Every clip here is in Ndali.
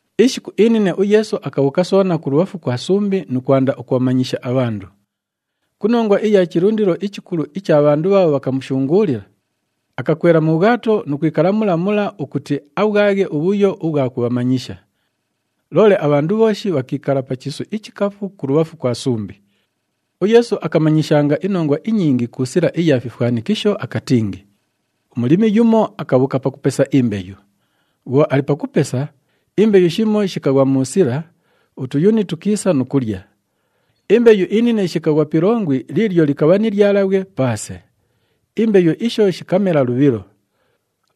Ishiku inine uYeesu akabhuuka soona kulubhafu kwa sumbi nu kwanda ukubhamanyisha abhandu. Ku nongwa iya chilundilo ichikulu icha bhandu bhaabho bhakamushunguulila, akakwela mu bhwato nu kwikala mula mula ukuti abhwaghe ubhuyo ubhwa kubhamanyisha. Loole abhandu bhooshi bhakiikala pa chiisu ichikafu kulubhafu kwa sumbi. UYeesu akamanyishanga inongwa inyingi ku sila iya fifwanikisho akatingi, “Umulimi yumo akabhuuka pakupesa imbeyu. Bhwo ali pakupesa, imbeyu shimo shikaghwa mu sila, utuyuni tukiisa nu kulya. Imbeyu inine shikaghwa pi ilongwi liilyo likabha ni lyalabhwe paase. Imbeyu isho shikamela lubhilo.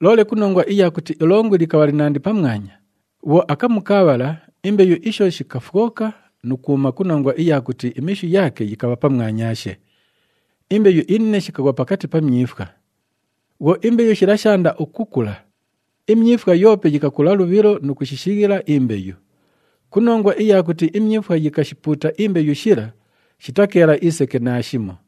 Loole ku nongwa iya kuti ilongwi likabha linandi pamwanya, bhwo akamu kaabhala, imbeyu isho shikafwoka nu kwuma ku nongwa iya kuti imishu yaake yikabha pamwanyaashe. Imbeyu inine shikaghwa pakati pa myifwa. Bhwo imbeyu shila shaanda ukukula, imyifwa yoope yikakula lubhilo nu kushishighila imbeyu. Ku nongwa iya kuti imyifwa yikashipuuta imbeyu shila, shitakeela iseke naashimo.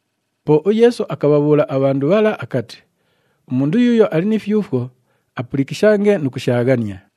Po uYeesu akabhabhuula abhandu bhala akati, “Umundu yuuyo ali ni fyufwo, apulikishange nu kushaaghania.”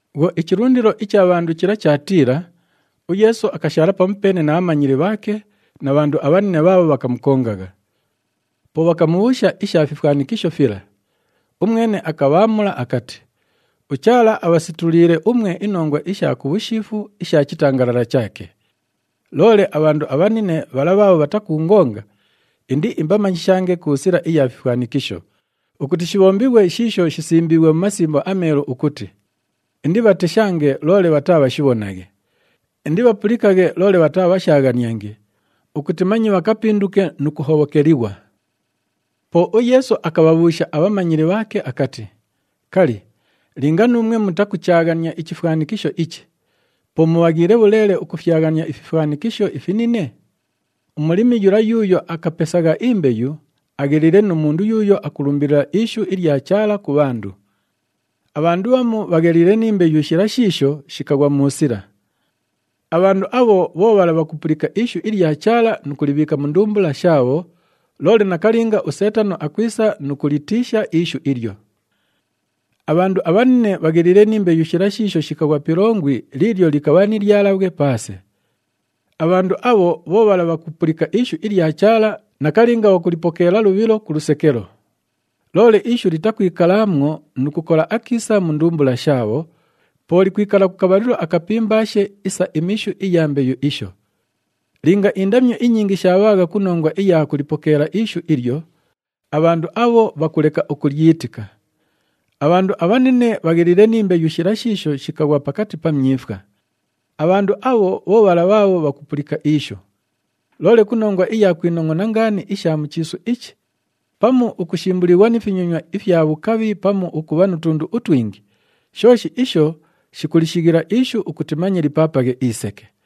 Bhwo ichilundilo icha bhandu chila chaatiila, uYeesu akashaala pamupeene na bhamanyili bhaake na bhandu abhanine bhaabho bhakamukongagha. Po bhakamubhuusha isha fifwanikisho fila. Umwene akabhaamula akati, “UChaala abhasetuliile umwe inongwa isha ku bhushiifu isha chitangalala chaake. Loole abhandu abhanine bhala bhaabho bhatakuungonga, indiimbamanyishange ku sila iya fifwanikisho, ukuti shibhombighwe shiisho shisimbiighwe mu Masimbo aMeelu ukuti, ‘Indibhateshange loole bhataabhashibhonaghe. Indibhapulikaghe loole bhataabhashaaghaniange, ukuti manye bhakapinduke nu kuhobhokelighwa.’” Po uYeesu akabhabhuusha abhamanyili bhaake akati, “Kali, linga nuumwe mutakuchaaghania ichifwanikisho ichi, po mubhaghiile bhuleele ukufyaghania ififwanikisho ifinine? Umulimi yula yuuyo akapesagha imbeyu agheliile nu mundu yuuyo akulumbilila ishu ilya Chaala ku bhandu. Abhandu bhamu bhagheliile ni mbeyu shila shiisho shikaghwa mu sila. Abhandu abho bho bhala bhakupulika ishu ilya Chaala nu kulibhiika mu ndumbula shaabho, loole nakalinga uSeetano akwisa nu kulitiisha ishu ilyo. Abhandu abhanine bhagheliile ni mbeyu shila shiisho shikaghwa pi ilongwi liilyo likabha ni lyalabhwe paase. Abhandu abho bho bhala bhakupulika ishu ilya Chaala, nakalinga bhakulipokeela lubhilo ku lusekelo. Loole ishu litakwikalaamwo nu kukola akiisa mu ndumbula shaabho, po likwikala ku kabhalilo akapimbaashe isa imishu iya mbeyu isho. Linga indamyo inyingi shaabhaagha ku nongwa iya kulipokeela ishu ilyo, abhandu abho bhakuleka ukulyitika. Abhandu abhanine bhagheliile ni mbeyu shila shiisho shikaghwa pakati pa myifwa. Abhandu abho bho bhala bhaabho bhakupulika ishu. Loole ku nongwa iya kwinongʼona ngaani isha mu chiisu ichi pamu ukushimbulighwa ni finyonywa ifya bhukabhi pamu ukubha nu tundu utwingi, shooshi isho shikulishighila ishu ukuti manye lipaapaghe iseke.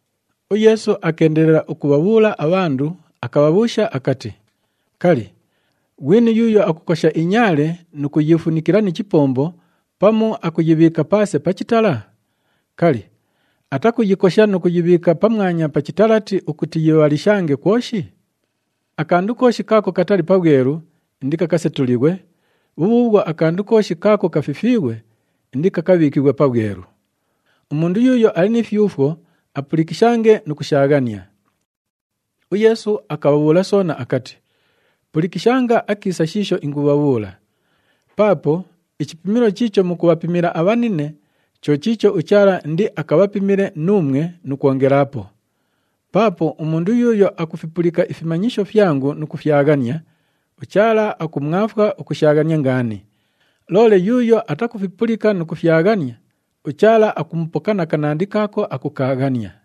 UYeesu akeendelela ukubhabhuula abhandu, akabhabhuusha akati, “Kali, ghwini yuuyo akukosha inyaale nu kuyiifunikila ni chipombo pamu akuyibhiika paase pa chitala? Kali, atakuyikosha nu kuyibhiika pamwanya pa chitalati ukuti yibhalishange kwoshi? Akandu kooshi kaako katali pabhwelu, indikakasetulighwe, bhubhuubhwo akandu kooshi kaako kafifiighwe, indikakabhiikighwe pabhwelu. Umundu yuuyo ali ni fyufwo, apulikishange nu kushaaghania.” UYeesu akabhabhuula soona akati, “Pulikishanga akiisa shiisho ingubhabhuula. Paapo ichipimilo chiicho mukubhapimila abhanine, cho chiicho uChaala indiakabhapimile nuumwe nu kwongelaapo. Paapo umundu yuuyo akufipulika ifimanyisho fyangu nu kufyaghania, uChaala akumwafwa ukushaaghania ngaani. Loole yuuyo atakufipulika nu kufyaghania, uChaala akumupoka na kanandi kaako akukaaghania.”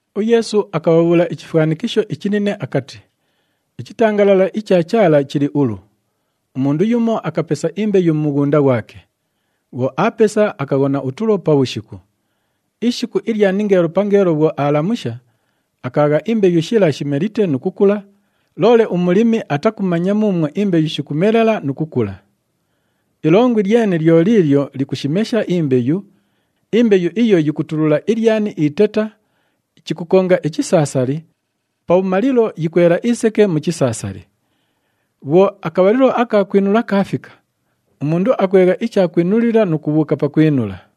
UYeesu akabhabhuula ichifwanikisho ichinine akati, “Ichitangalala icha Chaala chili ulu. Umundu yumo akapesa imbeyu mu mughunda ghwake. Bhwo aapesa, akaghona utulo pabhushiku. Ishiku ilya ningeelo pangeelo bhwo aalamusha, akaagha imbeyu shila shimelite nu kukula, loole umulimi atakumanya muumwo imbeyu shikumelela nu kukula. Ilongwi lyene lyo liilyo likushimesha imbeyu, imbeyu iyo yikutulula ilyani iteta, chikukonga ichisaasali, pabhumalilo yikwela iseke mu chisaasali. Bhwo akabhalilo aka kwinula kaafika, umundu akwegha ichakwinulila nu kubhuuka pakwinula.”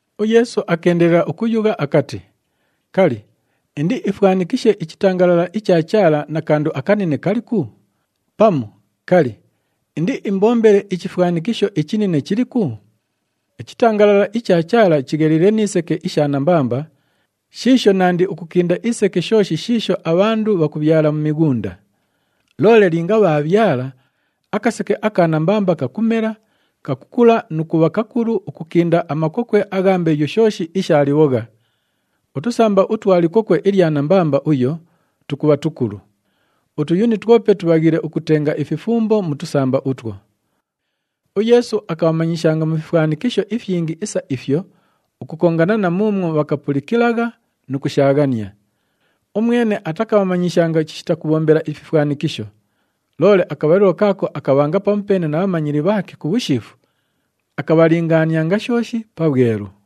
UYeesu akeendelela ukuyugha akati, “Kali, indiifwanikishe ichitangalala icha Chaala na kandu akanine kaliku? Pamu kali, indiimbombele ichifwanikisho ichinine chiliku? Ichitangalala icha Chaala chigheliile ni seke isha nambamba shiisho nandi ukukinda iseke shooshi shiisho abhandu bhakubhyala mu mighunda. Loole linga bhaabhyala, akaseke aka nambamba kakumela, kakukula nu kubha kakulu ukukinda amakokwe agha mbeyu shooshi isha libhogha. Utusamba utwa likokwe ilya nambamba uyo tukubha tukulu. Utuyuni twope tubhaghiile ukutenga ififumbo mu tusamba utwo.” UYeesu akabhamanyishanga mu fifwanikisho ifyingi isa ifyo ukukongana na muumwo bhakapulikilagha nu kushaaghania. Umwene atakabhamanyishanga chishita kubhombela ififwanikisho. Loole akabhalilo kaako akabhanga pamupeene na bhamanyili bhaake ku bhushiifu, akabhalingaanianga shooshi pabhwelu.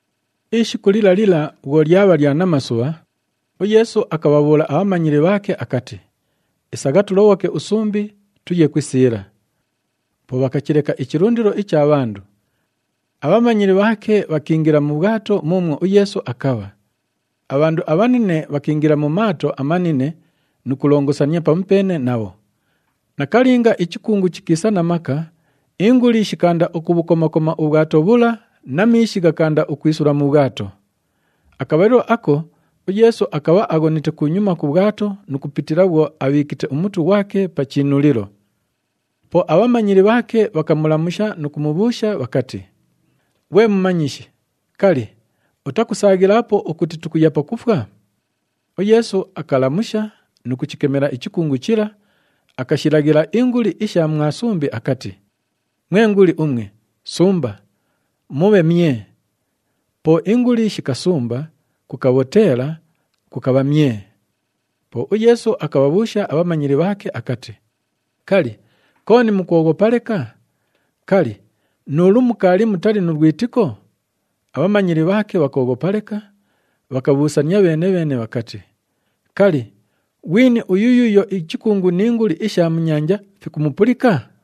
Ishiku lila lila bhwo lyabha lya namasubha, uYeesu akabhabhuula abhamanyili bhaake akati, “Isagha tulobhoke usumbi, tuye ku isiila.” Po bhakachileka ichilundilo icha bhandu. Abhamanyili bhaake bhakiingila mu bhwato muumwo uYeesu akabha. Abhandu abhanine bhakiingila mu maato amanine nu kulongosania pamupeene nabho. Nakalinga, ichikungu chikiisa na maka, inguli shikaanda ukubhukoma-koma ubhwato bhula na miishi ghakaanda ukwisula mu bhwato. Akabhalilo ako uYeesu akabha aghonite kunyuma ku bhwato nu kupitila bhwo abhiikite umutu ghwake pa chiinulilo. Po abhamanyili bhaake bhakamulamusha nu kumubhuusha bhakati, “Ghwe Mumanyishi! Kali, utakusaaghilaapo ukuti tukuya pakufwa?” UYeesu akalamusha nu kuchikemela ichikungu chila, akashilaghila inguli isha mwa sumbi akati, “Mwe nguli umwe, sumba! Mubhe myee!” Po inguli shikasumba, kukabhoteela, kukabha myee. Po uYeesu akabhabhuusha abhamanyili bhaake akati, “Kali, kooni mukwoghopa leka? Kali, nu ulu mukaali mutali nu lwitiko?” Abhamanyili bhaake bhakooghopa leka, bhakabhuusania bheene-bheene bhakati, “Kali, ghwini uyu yuuyo ichikungu ni nguli isha mu nyanja, fikumupulika?”